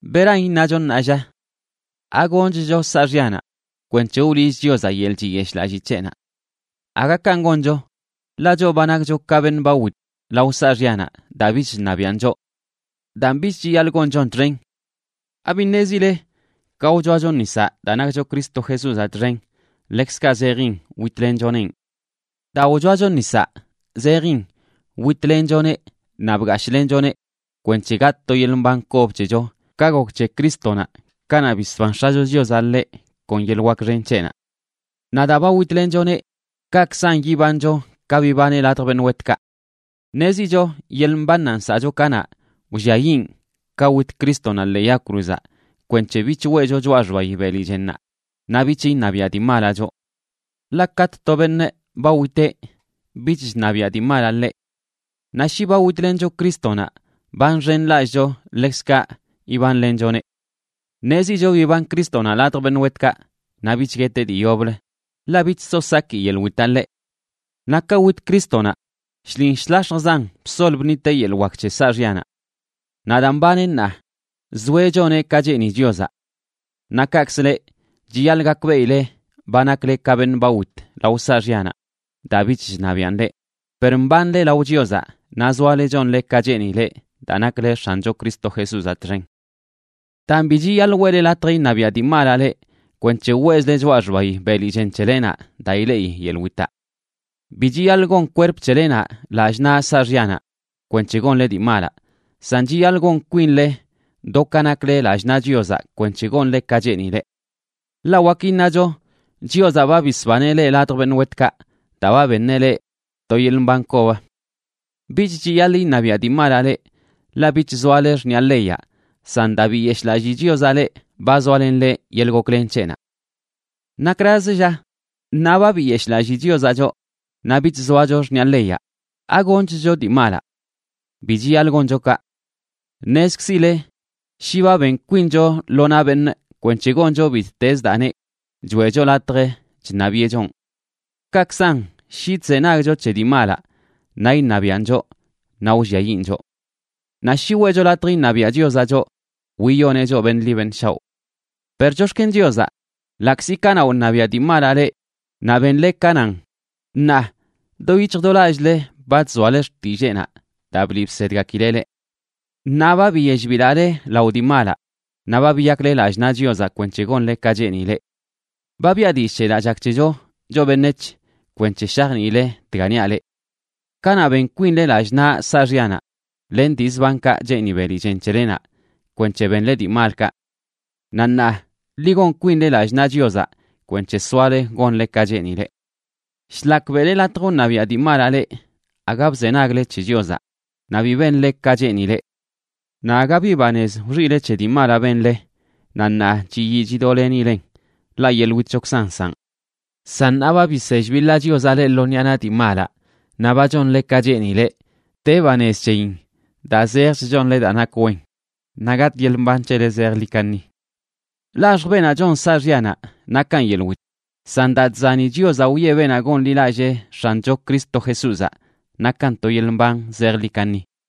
¿Beran iṉacho ṉaa, lla? ¿Agonchcho saaxyanaꞌ kwenc̱he wliꞌch Chiozaꞌ yeḻꞌ chiyeshꞌlallii c̱heꞌnaꞌ? ¡Aga kanꞌ goncho! Ḻaꞌ choꞌ ba nakcho ka beṉꞌ ba wit lao saaxyanaꞌ daa bich chṉabiꞌan choꞌ. Daan, bich chiyaḻꞌ gonchon txen. ¿Abi ṉezile ka wchoacho nisaꞌ daa nakcho Cristo Jesúzaꞌ txen, ḻekzkaꞌ zejin witlenchonenꞌ? Daa wchoacho nisaꞌ zejin witlenchoneꞌ naꞌ bgashꞌlenchoneꞌ kwenc̱he gatꞌ to yeḻꞌ mban kob c̱hecho ka gok c̱he Crístonaꞌ kanaꞌ bisban X̱acho Chiozaꞌ ḻeꞌ kon yeḻꞌ wak xen c̱heꞌnaꞌ. Naꞌ daa ba witlenchoneꞌ, kaꞌkzan yibancho ka bibaneꞌ ladj beṉꞌ wetkaꞌ. Ṉezicho yeḻꞌ mbannaꞌ nsaꞌcho kanaꞌ, wlliayiꞌn ka wit Crístonaꞌ ḻee yag cruzaꞌ kwenc̱he bich weꞌcho choꞌa xbayi beli chennaꞌ naꞌ bich iṉabiaꞌ dii malaꞌ choꞌ. Ḻaꞌ katꞌ to beṉꞌ ba witeꞌ, bich chṉabiaꞌ dii malaꞌ ḻeꞌ. Naꞌ shi ba witlencho Crístonaꞌ, ba nxenlallꞌcho ḻekzkaꞌ ibanlenchoneꞌ. Ṉezicho biban Crístonaꞌ ladj beṉꞌ wetkaꞌ naꞌ bich gueteꞌ dii yoblə, ḻaꞌ bich so saki yeḻꞌ witaꞌ ḻeꞌ. Naꞌ ka wit Crístonaꞌ, shlin shlax̱jzan bsol bṉiteꞌ yeḻꞌ wak c̱he saaxyanaꞌ. Naꞌ daa mbaneꞌ ṉaa, zoeꞌ choneꞌ ka cheeni Chiozaꞌ. Naꞌ kaꞌkzə leꞌ, chiyaḻꞌ gakbeꞌile ba nakle ka beṉꞌ ba wit lao saaxyanaꞌ daa bich chṉabiaꞌn leꞌ, per mbanle lao Chiozaꞌ naꞌ zoale chonle ka cheenileꞌ daa nakle X̱ancho Cristo Jesúzaꞌ txen. Daan bi chiyaḻꞌ weꞌle latj iṉabiaꞌ dii malaꞌ leꞌ kwenc̱he weꞌzle choꞌa xbayi beli chen c̱helenaꞌ daa ileꞌi yeḻꞌ witaꞌ. Bi chiyaḻꞌ gon kwerp c̱helenaꞌ lallꞌ naꞌ saaxyanaꞌ kwenc̱he gonle dii malaꞌ, san chiyaḻꞌ gon kwinle do ka nakle lallꞌ naꞌ Chiozaꞌ kwenc̱he gonle ka cheenileꞌ. Ḻaꞌ wak iṉacho Chiozaꞌ ba bisbaneꞌ leꞌ ladj beṉꞌ wetkaꞌ daa ba beṉeꞌ leꞌ to yeḻꞌ mban kob. Bich chiyaḻꞌ iṉabiaꞌ dii malaꞌ leꞌ, ḻaꞌ bich zoale xṉiꞌa leyaꞌ, san daa biyeshꞌlallii Chiozaꞌ leꞌ, ba zoalenle yeḻꞌ goklen c̱heꞌnaꞌ. ¿Nakrazə, lla? Ṉaa ba biyeshꞌlallii Chiozaꞌ choꞌ, naꞌ bich zoacho xṉiꞌa leyaꞌ, ¿agonchcho dii malaꞌ? ¡Bi chiyaḻꞌ goncho kaꞌ! Ṉezkzile shi ba ben kwincho lo naꞌ beṉꞌ kwenc̱he goncho bittez daa neꞌ, choeꞌcho latj chṉabiꞌe chonꞌ. Kaꞌkzan, shi chzenagcho c̱he dii malaꞌ, naꞌ iṉabiaꞌn choꞌ naꞌ wlliayiꞌn choꞌ. Naꞌ shi weꞌcho latj iṉabiaꞌ Chiozaꞌ choꞌ, wiyoneꞌ choꞌ beṉꞌ ḻi beṉꞌ shaoꞌ. Per chox̱ken Chiozaꞌ, ḻaꞌkzi kanaꞌ wṉabiaꞌ dii malaꞌ leꞌ naꞌ benle ka nan, ṉaa do yic̱hj do lallꞌle ba chzoale xtilleenaꞌ daa bliꞌ bsedgakileꞌ leꞌ. Ṉaa ba biyell bilaꞌle lao dii malaꞌ, naꞌ ba biyakle lallꞌ naꞌ Chiozaꞌ kwenc̱he gonle ka cheenileꞌ. Ba biꞌa dillꞌ c̱he daa chak c̱hecho choꞌ beṉec̱h kwenc̱he shajniile dga niaꞌ leꞌ. Kanaꞌ ben kwinle lallꞌ naꞌ saaxyanaꞌ len dii zbankaꞌ cheeni beli chen c̱helenaꞌ kwenc̱he benle dii malkaꞌ. Naꞌ ṉaa, ḻi gon kwinle lallꞌ naꞌ Chiozaꞌ kwenc̱he soale gonle ka cheenileꞌ. Shlak beꞌle latj wṉabiaꞌ dii malaꞌ leꞌ, aga bzenagle c̱he Chiozaꞌ naꞌ bi benle ka cheenileꞌ. Naꞌ aga bi banez wxiꞌle c̱he dii malaꞌ benle naꞌ ṉaa chiyii chidoꞌlenileꞌn, ḻaꞌ yeḻꞌ witchokzan nsaꞌn. San ṉaa ba bisell biḻaꞌ Chiozaꞌ leꞌ lo ṉiꞌa naꞌ dii malaꞌ naꞌ ba chonle ka cheenileꞌ, de banez c̱heyin daa zejch chonle daa nak wen, naꞌ gatꞌ yeḻꞌ mban c̱hele zejḻi kaṉi. Laxj beenaꞌ chon saaxyanaꞌ nakan yeḻꞌ wit, san daa chzani Chiozaꞌ wiꞌe beenaꞌ gonḻilallee X̱ancho Cristo Jesúzaꞌ nakan to yeḻꞌ mban zejḻi kaṉi.